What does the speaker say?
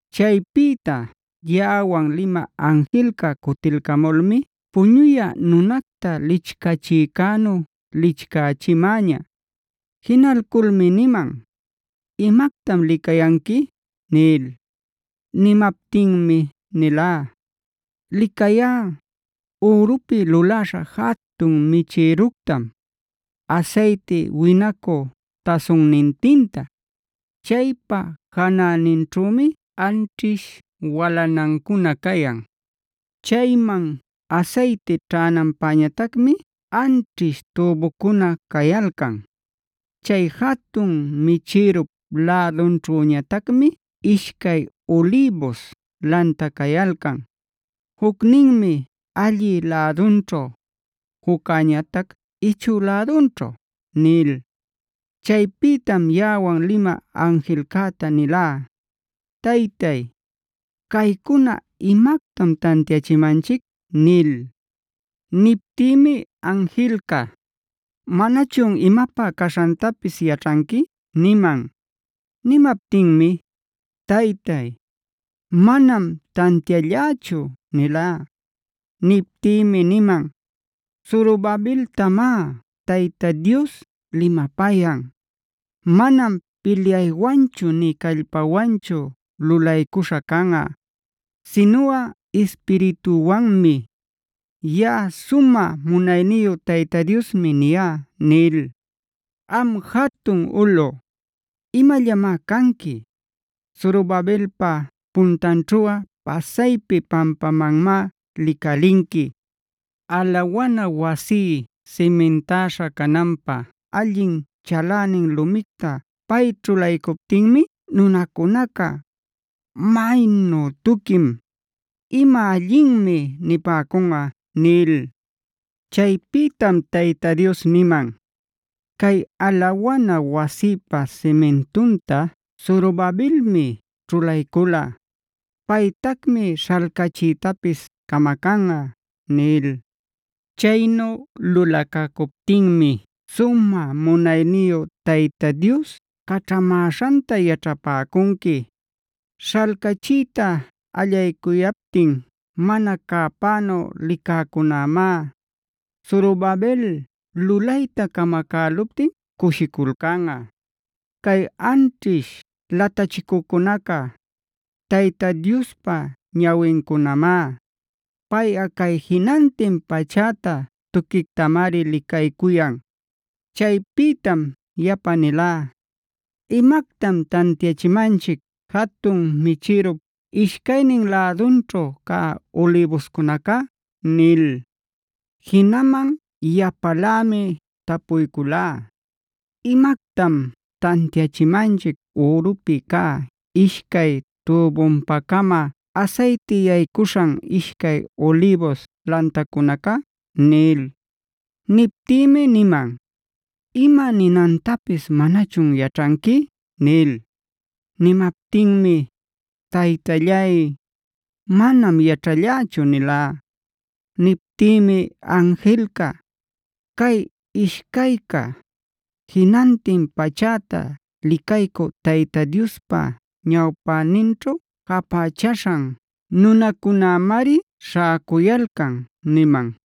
Chaypïta yaꞌawan limä anjilca cutilcamulmi puñuyä nunacta lichcachïcänu lichcächimäña. Jinalculmi niman: “¿Imactam licayanqui?” nil. Nimaptinmi nilá: “Licayá, ürupi luläśha jatun michïructam, asayti winacu tasunnintinta. Chaypa janäninćhümi anćhish walanancuna cayan; chayman asayti ćhänanpäñatacmi anćhish tübucuna cayalcan. Chay jatun michïrup lädunćhüñatacmi ishcay ulïbus lanta cayalcan; jucninmi allï lädunćhu, juccäñatac ichü lädunćhu” nil. Chaypïtam yaꞌawan limä anjilcäta nilá: “Taytay, ¿caycuna imactam tantiachimanchic?” nil. Niptïmi anjilca: “¿Manachun imapä caśhantapis yaćhanqui?” niman. Nimaptinmi: “Taytay, manam tantiallächu” nilá. Niptïmi niman: “Zorobabeltamá Tayta Dios limapayan: ‘Manam pilyaywanchu nï callpawanchu lulaycuśha canꞌa, sinuꞌa Ispiritüwanmi. Yaꞌa sumä munayniyu Tayta Diosmi niyá’ nil. ¿Am jatun ulꞌu, imallamá canqui? Zorobabelpa puntanćhuꞌa pasaypi pampamanmá licalinqui. Alawana wasí simintäśha cananpä allin chalänin lumicta pay ćhulaycuptinmi nunacunaca: ‘¡Maynu tuquim! ¡Ima allinmi!’ nipäcunꞌa” nil. Chaypïtam Tayta Dios niman: “Cay alawana wasïpa simintunta Zorobabelmi ćhulaycula; paytacmi śhalcachiytapis camacanꞌa” nil. Chaynu lulacacuptinmi sumä munayniyu Tayta Dios caćhamäśhanta yaćhapäcunqui. Śhalcachiyta allaycuyaptin mana cäpänu licäcunämá, Zorobabel lulayta camacäluptin cushiculcanꞌa. Cay anćhish latachicücunaca, Tayta Diospa ñawincunamá; payꞌa cay jinantin pachäta tuquictamari licaycuyan. Chaypïtam yapa nilá: “¿Imactam tantiachimanchic jatun michïrup ishcaynin lädunćhu cä ulïbuscunaca?” nil. Jinaman yapalämi tapuyculá: “¿Imactam tantiachimanchic ürupi cä ishcay tübunpa-cama asayti yaycuśhan ishcay ulïbus lantacunaca?” nil. Niptïmi niman: “¿Ima ninantapis manachun yaćhanqui?” nil. Nimaptinmi: “Taytallay, manam yaćhallächu” nilá. Niptïmi anjilca: “Cay ishcayca, jinantin pachäta licaycü Tayta Diospa ñawpäninćhu japächaśhana nunacunämari śhäcuyalcan” niman.